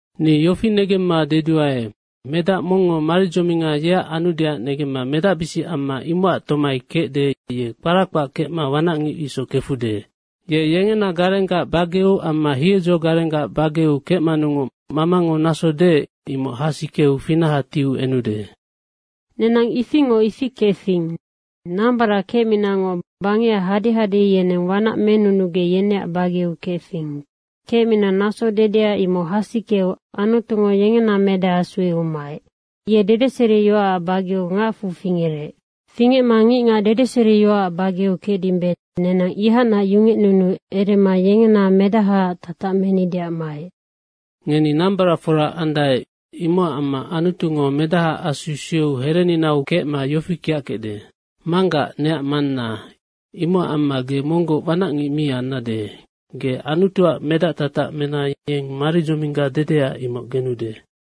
Ni yofi negemma deduae, medac mongngo maridzominga yeac anudeac negemma medacbisic amma imocac tomai kecde, ye kpara kpac kecma wanacngic isoc kefude. Ye yengena garenggac bageu amma hiedzo garenggac bageu kecmanungoc mamango naso deec, imoc hasikeu finaha tiu enude. Nenang ifingoc ifi kefing. Nambarac kecminangoc bangecac hadehade yeneng wanac menunugec yeneac bageu kefing. Kecmina naso dedea, imoc hasikeu Anutungo yengena Medaha sueu maec. Ye dedeseriyoacac bageu ngacfu fingerec. Fingecma ngicngac dedeseriyoac bageu kecdimbe, nenang ihacnac yungecnunuu erema yengena medahaac tatac menideac maec. Ngeni nambaracfora andae, imocac amma Anutungo Medahaac Asu sueu hereninau kecma yofi kiackecde, “Manggac, neac Manna.” Imocac amma, ge monggoc wanacngic mi annade. Ge Anutuac medactatac mena yeng maridzomingga dedea, imoc genude.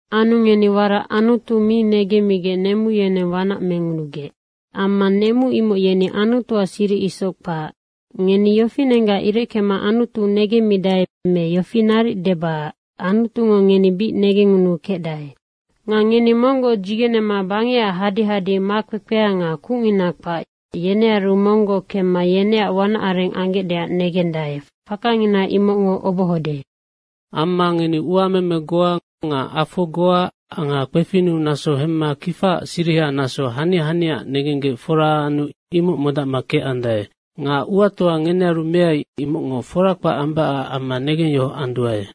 Anu ngeni warac Anutu mi negenggec nemu yeneng wanac mengunugec. Amma nemu imoc yeni Anutuac siric isoc kpac. Ngeni yofinenggac ireckema Anutu negemmidae me yofi naric deba, Anutungo ngeni bic negengngunuu kecdae. Nga ngeni monggoc dzigenema bangecac hadehade makpekpea nga kucngina kpac, yenearu monggoc kemma yeneac wanac areng anggecdeac negendae, fakangina imocngo obohode. Amma ngeni uameme goa nga afo goa nga kpefinnu naso hemma kifaac siriha naso hania haniaac negenggec fora anu imoc modacma kecandae. Nga uatoa ngenearu meai, imocngo fora kpac ambacac amma negengyohoc anduae.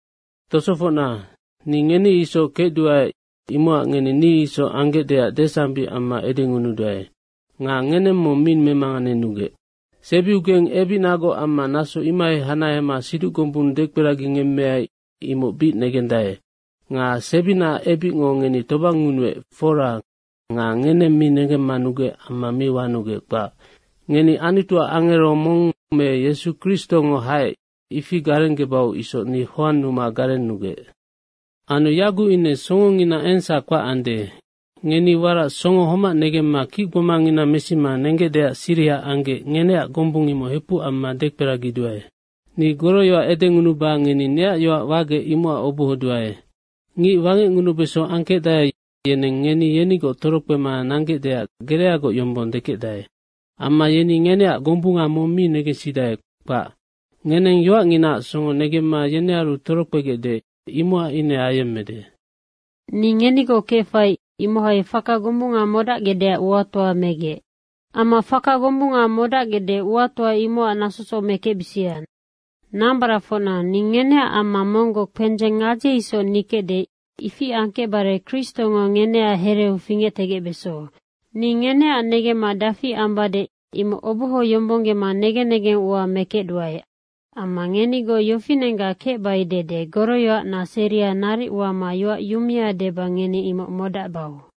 Tosofocna, ni ngeni isoc kecduae, imocac ngeni ni isoc anggecdeac desambic amma edengunuduae. Nga ngeneng mong mi memanganenugec. Sebiugeng ebicnagoc amma naso imohai hanahema siduc gombung dekperagingemmeai, imoc bic negendae. Nga sebinaac ebicngo ngeni tobangngunuec, fora nga ngeneng mi negemmanugec amma mi wanugec, kpac. Ngeni Anutuac angero mong me Yesu Kristongo haec, ifi garenggebau isoc ni hoannuma garennugec. Anu yaguc ine songongina engsac kpac ande. Ngeni warac songo homac negemma kicgbomangina mesima nenggecdeac siriha anggec, ngeneac gombung imoc hepuc amma dekperagiduae. Ni goroyoac edengunuba ngeni neac yoac wagec, imocac obohoduae. Ngic wangecngunubeso angkecdae, yeneng ngeni yenigoc torokpema nanggecdeac gereagoc yombong dekecdae. Amma yeni ngeneac gombunga mong mi negensidae, kpac. Ngeneng yoacnginaac songo negemma yenearu torokpegecde, imocac ine ayemmede. Ni ngenigoc kefai, imohai faka gombunga modacgecdeac uatoa megec. Amma faka gombunga modacgecde, uatoa imocac nasosoc mekecbisia. Nambaracfocna, ni ngeneac amma monggoc kpendzeng gadze isoc nikecde, ifi angkecbare Kristongo ngeneac hereu fingectegecbeso. Ni ngeneac negemma dafi ambade, imoc obohoyombonggema negen negeng ua mekecduae. Amma ngenigoc yofinenggac kecbai dede goroyoacna seria naric wama yoac yumea deba ngeni imoc modacbau.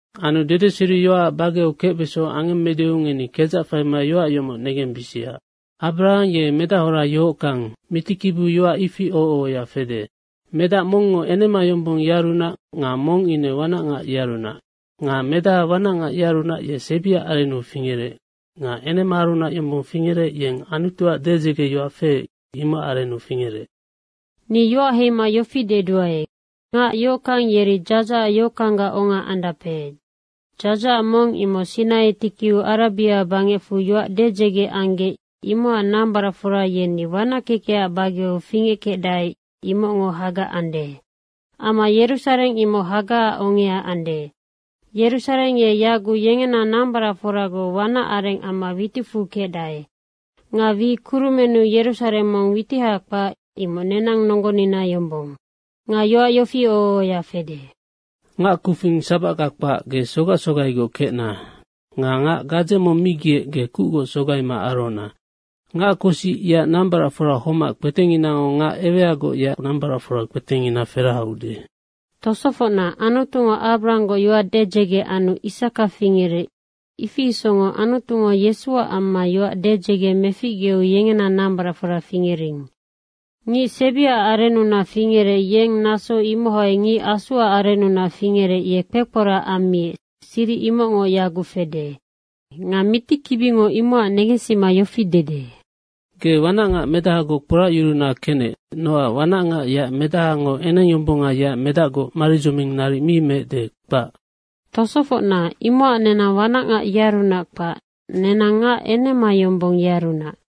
Anu dedeseriyoacac bageu kecbeso angemmedeu, ngeni kedzac faima yoac yomoc negembisia, Abarahang ye medahora yohockang, mitikibiu yoac ifi oho ohoya fede, medac mongngo enema yombong, yearunac nga mong ine wanacngac yearunac. Nga medaha wanacngac yearunac, ye sebiac arennu fingerec nga enemaarunac yombong fingerec, yeng Anutuac dedzegeyoac feec, imocac arennu fingerec. Ni yoac heima yofi deduae. Ngac yohockang yeri dzadzahac yohockanggac onga andape. Dzadzahac mong imoc Sinai tikiu Arabia bangecfu yoac dedzege anggec, imocac nambaracfora yeni wanac kekecac bageu fingeckecdae, imocngo Haga ande. Amma Yerusareng imoc Hagaac ongea ande. Yerusareng ye yaguc yengena nambaracforagoc wanac areng amma witicfu kecdae. Nga wi kurumennu Yerusareng mong witiha kpac, imoc nenang nonggonina yombong. Nga yoac yofi oho ohoya fede, “Ngac kufing sabacga kpac, ge sogac sogaigoc kecna. Nga ngac gadze mong mi giec, ge kucgoc sogaima arohona. Ngac kosic yeac nambaracfora homac, kpetenginango ngac eweagoc yeac nambaracfora kpetengina feraheude.” Tosofocna, Anutungo Abrahanggoc yoac dedzege anu Isaka fingerec, ifi isocngoc Anutungo Yesuac amma yoac dedzege meficgeu yengena nambaracfora fingering. Ngic sebiac arennunac fingerec, yeng naso imohai ngic Asuac arennunac fingerec, ye kpekporac ammiec, siric imocngo yaguc fede. Nga mitikibingo imocac negensima yofi dede, “Ge wanacngac medahagoc kporacyuruna kenec, nocac wanacngac yeac medahango enengyombonga yeac medacgoc maridzoming naric mi meecde, kpac.” Tosofocna, imocac nenang wanacngac yearunac kpac, nenang ngac enema yombonga yearunac.